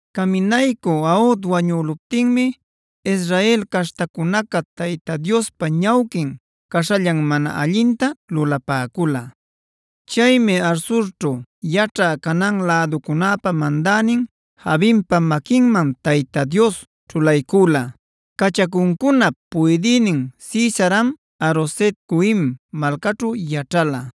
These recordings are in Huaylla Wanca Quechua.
Caminaycü Aod wañüluptinmi Israel caśhtacunaca Tayta Diospa ñawquin caśhallan mana allinta lulapäcula. Chaymi Hazorćhu yaćhä Canaan läducunäpa mandänin Jabinpa maquinman Tayta Dios ćhulaycüla. Cachacuncunap puydïnin Sisaram Haroset-goim malcaćhu yaćhala.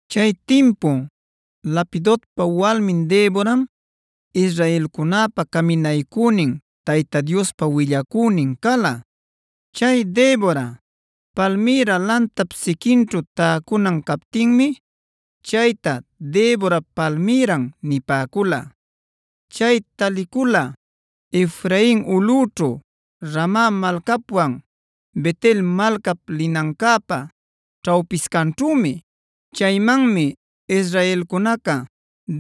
Chay timpu Lapidotpa walmin Deboram israelcunäpa caminaycünin Tayta Diospa willacünin cala. Chay Debora, palmïra lantap siquinćhu täcunan captinmi chayta “Deborap palmïran” nipäcula. Chay talicula Efrain ulꞌućhu Rama malcapwan Bet-el malcap linancäpa ćhawpiscanćhümi. Chaymanmi israelcunaca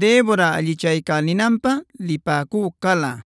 Debora allichaycälinanpä lipäcü cala.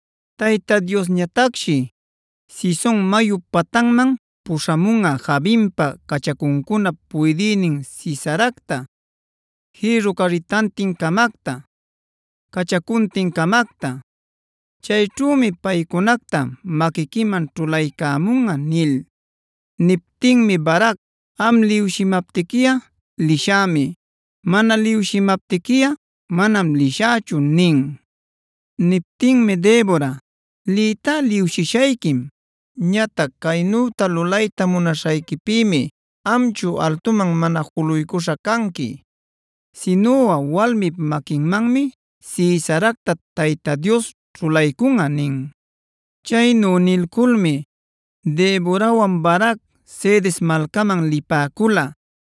Tayta Diosñatacshi Cison mayup patanman puśhamunꞌa Jabinpa cachacuncunap puydïnin Sisaracta jïrru carritantin-camacta, cachacuntin-camacta. Chayćhümi paycunacta maquiquiman ćhulaycamunꞌa” nil. Niptinmi Barac: “Am liwshimaptiquiꞌa lishämi. Mana liwshimaptiquiꞌa manam lishächu” nin. Niptinmi Debora: “Liytá liwshishayquim. Ñatac caynu lulayta munaśhayquipïmi amchu altuman mana juluycuśha canqui, sinuꞌa walmip maquinmanmi Sisaracta Tayta Dios ćhulaycunꞌa” nin. Chaynu nilculmi Deborawan Barac Cedes malcaman lipäcula.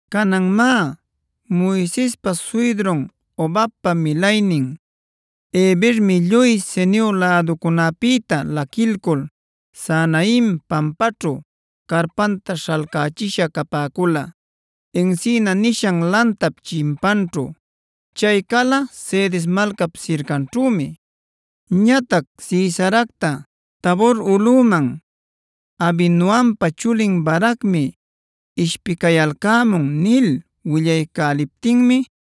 Canan má, Moisespa suydrun Hobabpa milaynin Hebermi lluy Ceneo läducunäpïta laquiculcul Zaanaim pampaćhu carpanta śhalcächisha capäcula, encina nishan lantap chimpanćhu. Chay cala Cedes malcap sircanćhümi. Ñatac Sisaracta: “Tabor ulꞌuman Abinoampa chulin Baracmi ishpicayalcämun” nil willaycäliptinmi,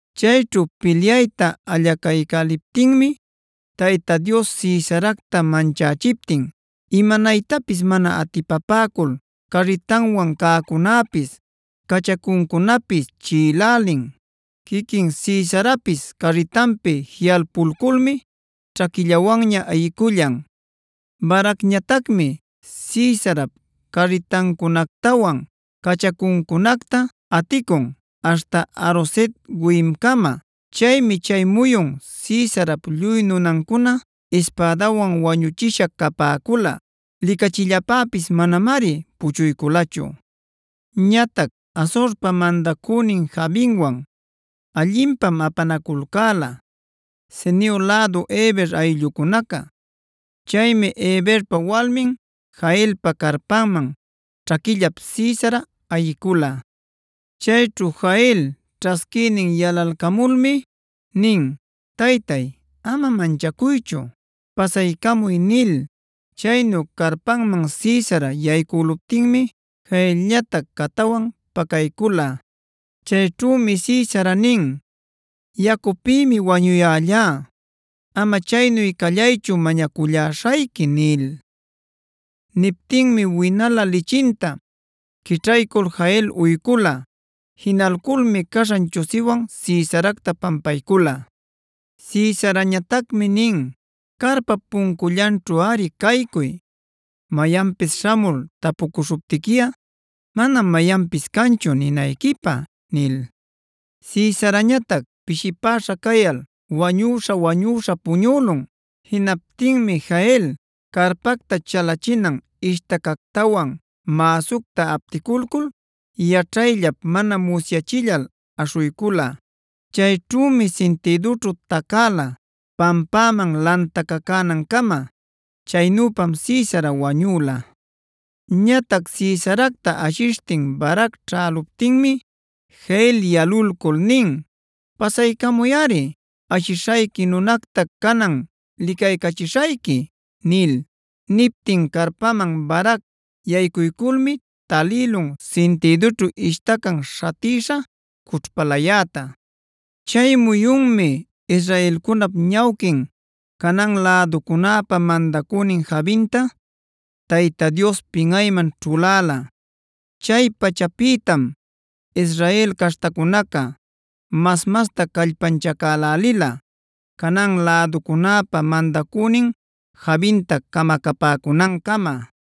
Chayćhu pilyayta allacaycäliptinmi Tayta Dios Sisaracta manchächiptin imanaytapis mana atipapäcul carritanwan cäcunäpis, cachacuncunapis chiꞌilälin. Quiquin Sisarapis carritanpi jiꞌalpulculmi ćhaquillawanña ayicullan. Baracñatacmi Sisarap carritancunactawan cachacuncunacta aticun aśhta Haroset-goimcama. Chaymi chay muyun Sisarap lluy nunancuna ispädawan wañüchisha capäcula; licachillapäpis manamari puchuyculachu. Ñatac Hazorpa mandacünin Jabinwan allinpam apanaculcäla Ceneo lädu Heber ayllucunaca. Chaymi Heberpa walmin Jaelpa carpanman ćhaquillap Sisara ayicula. Chayćhu Jael ćhasquïnin yalalcamulmi nin: “Taytay, ama manchacuychu. Pasaycamuy” nil. Chaynu carpanman Sisara yaycüluptinmi Jaelñatac catawan pacaycula. Chayćhümi Sisara nin: “Yacupïmi wañuyällá. Ama chaynu callaychu mañacullaśhayqui” nil. Niptinmi winalä lichinta quićhaycul Jael uycula. Jinalculmi caśhan chusiwan Sisaracta pampaycula. Sisarañatacmi nin: “Carpap puncullanćhuꞌari caycuy. Mayanpis śhamul tapucuśhuptiquiꞌa, ‘manam mayanpis canchu’ ninayquipä” nil. Sisarañatac pishipäśha cayal wañuśha-wañuśha puñülun. Jinaptinmi Jael carpacta chalachina ishtacactawan mäsucta apticulcul yaćhayllap mana musyachillal aśhuycula. Chayćhümi sintïdućhu tacäla pampäman lantacacanancama. Chaynüpam Sisara wañüla. Ñatac Sisaracta ashishtin Barac ćhäluptinmi Jael yalulcul nin: “Pasaycamuyꞌari. Ashishayqui nunacta canan licaycachishayqui” nil. Niptin carpanman Barac yaycuyculmi talïlun sintïdunćhu ishtacan śhatïsha cućhpalayäta. Chay muyunmi israelcunap ñawquin Canaan läducunäpa mandacünin Jabinta Tayta Dios pinꞌayman ćhuläla. Chay pachapïtam Israel caśhtacunaca mas-masta callpanchacälälila Canaan läducunäpa mandacünin Jabinta camacapäcunancama.